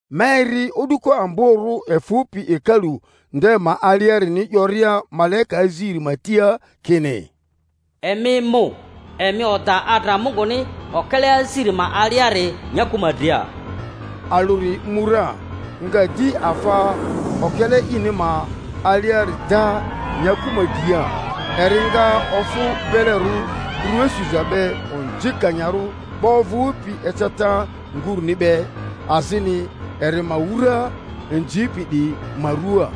Ma eri o'duko amborᴜ efᴜpi hekalu nde ma aliarini 'yoria malaika aziri ma tia kini, Emi mu, emi oda adra Munguni okele aziri ma aliari nyaku ma dria. Alᴜri mu ra, nga di afa okele ini ma aliari da nyaku ma dria; eri nga ofᴜ belerᴜ rᴜa suza be onzikanyarᴜ 'ba ovᴜpi eceta nguruni be, azini eri ma wura inzipi 'diyi ma ruaa.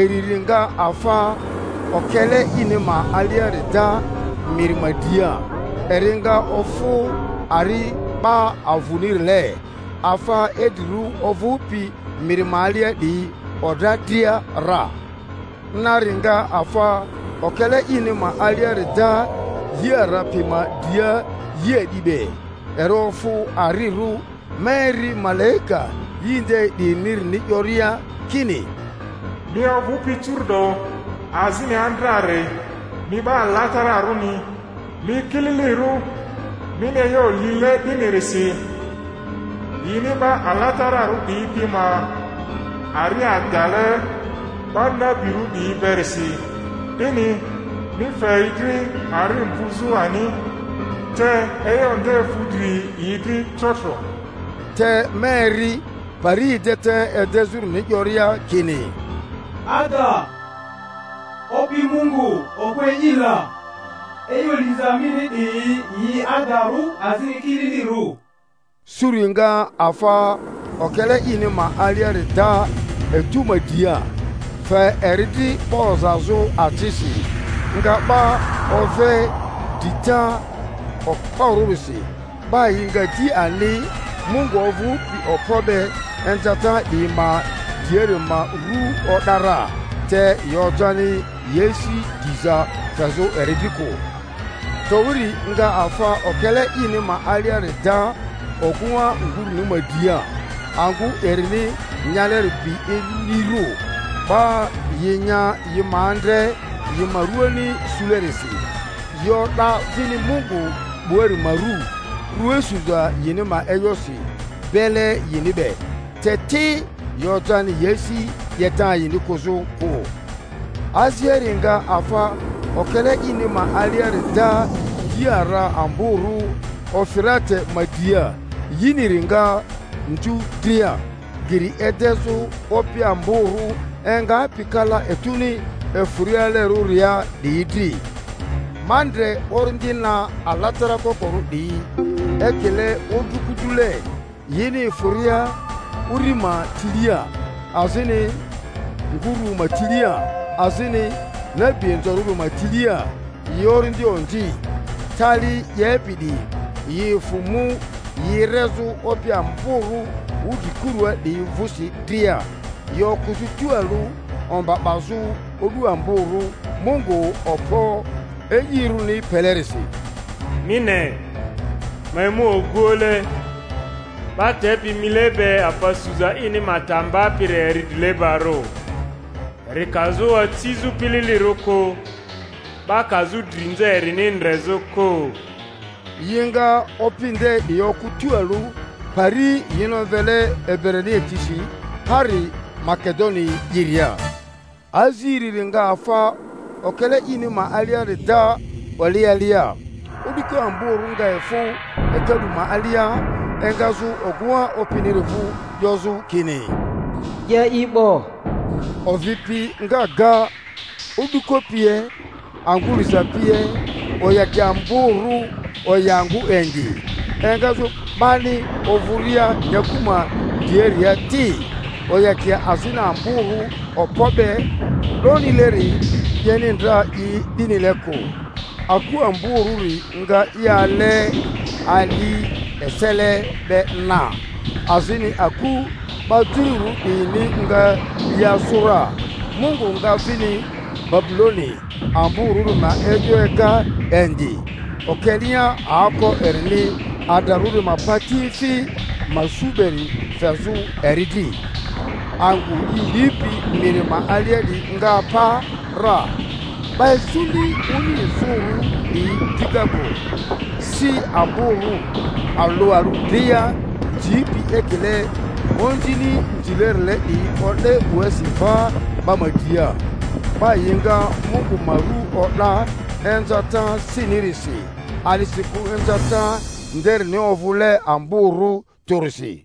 Iriri nga afa okele ini ma aliari da miri ma dria; eri nga ofᴜ ari 'ba avᴜnirile, afa idrirᴜ ovᴜpi miri ma alia 'diyi odra dria ra. Nari nga afa okele ini ma aliari da yi ara pi ma dria yi a'di be; eri ofᴜ arirᴜ. Ma eri malaika yi nde 'diyinirini 'yoria kini, Mi ovᴜpi curu'do, azini andrari, mi 'Ba Alatararᴜni, mi kililirᴜ mini e'yo lile 'dinirisi. Yini 'ba alatararᴜ 'diyi pi ma ari adale 'ba nabirᴜ 'diyi berisi, 'dini mi fe yi dri ari mvᴜzᴜ ani. Te e'yo nde fu dri yi dri trotro! Te ma eri pari edeta edezᴜrini 'yoria kini, Ada, Opi Mungu, Okpo E'i la, e'yo liza mini 'diyi yi adarᴜ azini kililirᴜ. Suri nga afa okele ini ma aliari da etu ma dria; fe eri dri 'ba ozazᴜ acisi; nga 'ba ove drita okporᴜrisi, 'ba yi nga di ani Mungu ovᴜpi okpo be inzata 'diyi ma driari ma rᴜ o'da ra, te yi ojani yi asi diza fezᴜ eri dri kᴜ. Towiri nga afa okele ini ma aliari da ogᴜŋa nguruni ma dria; angᴜ erini nyaleri bi inirᴜ, 'ba yi nya yi ma andre yi ma rᴜani sulerisi, yi o'da vini Mungu 'buari ma rᴜ, rua suza yini ma e'yosi bele yini be, te ti, yi ojani yi asi 'yeta yini kᴜzᴜ kᴜ. Aziari nga afa okele ini ma aliari da yi ara amborᴜ Ufirate ma dria; yiniri nga nzu dria, geri edezᴜ opi amborᴜ engapi kala etuni efᴜrialerᴜria 'diyi dri. Ma ndre orindi na alatara kokorᴜ 'diyi ekile odruko-drule, yini efᴜria uri ma tilia, azini nguru ma tilia, azini nabi inzorᴜri ma tilia; yi orindi onzi, tali 'yepi 'diyi; yi efᴜ mu yi erezᴜ opi amborᴜ wudrikurᴜa 'diyi vᴜsi dria, yi okᴜzᴜ tualᴜ omba 'bazᴜ o'du amborᴜ Mungu Okpo E'irᴜni pelerisi. (Mi ne, ma emu oguoᴜle! 'Ba tepi mile be, afa suza ini ma ta mbapiri eri drilebarᴜ, eri kazᴜ acizᴜ pililirᴜ kᴜ, 'ba kazᴜ drinza erini ndrezᴜ kᴜ!) Yi nga opi nde 'diyi okᴜ tualᴜ pari yini omvele Ebrania tisi Hari-Magedoni'iria. Aziriri nga afa okele ini ma aliari da oli alia; o'duko amborᴜ nga efᴜ hekalu ma alia engazᴜ ogᴜŋa opiniri vᴜ, 'yozᴜ kini, 'Ye i 'bo! Ovi pi nga ga, o'duko pie, angᴜ liza pie; oyakia amborᴜ oya angᴜ indi, engazᴜ 'bani ovᴜria nyakᴜ ma driaria ti, oyakia azini amborᴜ okpo be 'donileri 'yeni ndra i 'dinile kᴜ. Aku amborᴜri nga i ale ali esele be na, azini aku 'ba jururᴜ 'diyini nga yi asᴜ ra, Mungu nga vini Babuloni amborᴜri ma e'yo ega indi, okelea aoko erini adrarᴜri ma patiefi ma su beri fezᴜ eri dri. Angᴜ yi lipi miri ma alia 'diyi nga apa ra, 'ba isuni oni izᴜrᴜ 'diyi dika kᴜ; si amborᴜ, alᴜ alᴜ dria nzipi ekile onzini nzilerile 'diyi o'de 'buasi va 'ba ma dria; 'ba yi nga Mungu ma rᴜ o'da inzata sinirisi, a'disikᴜ inzata nderini ovᴜle amborᴜ tᴜrisi.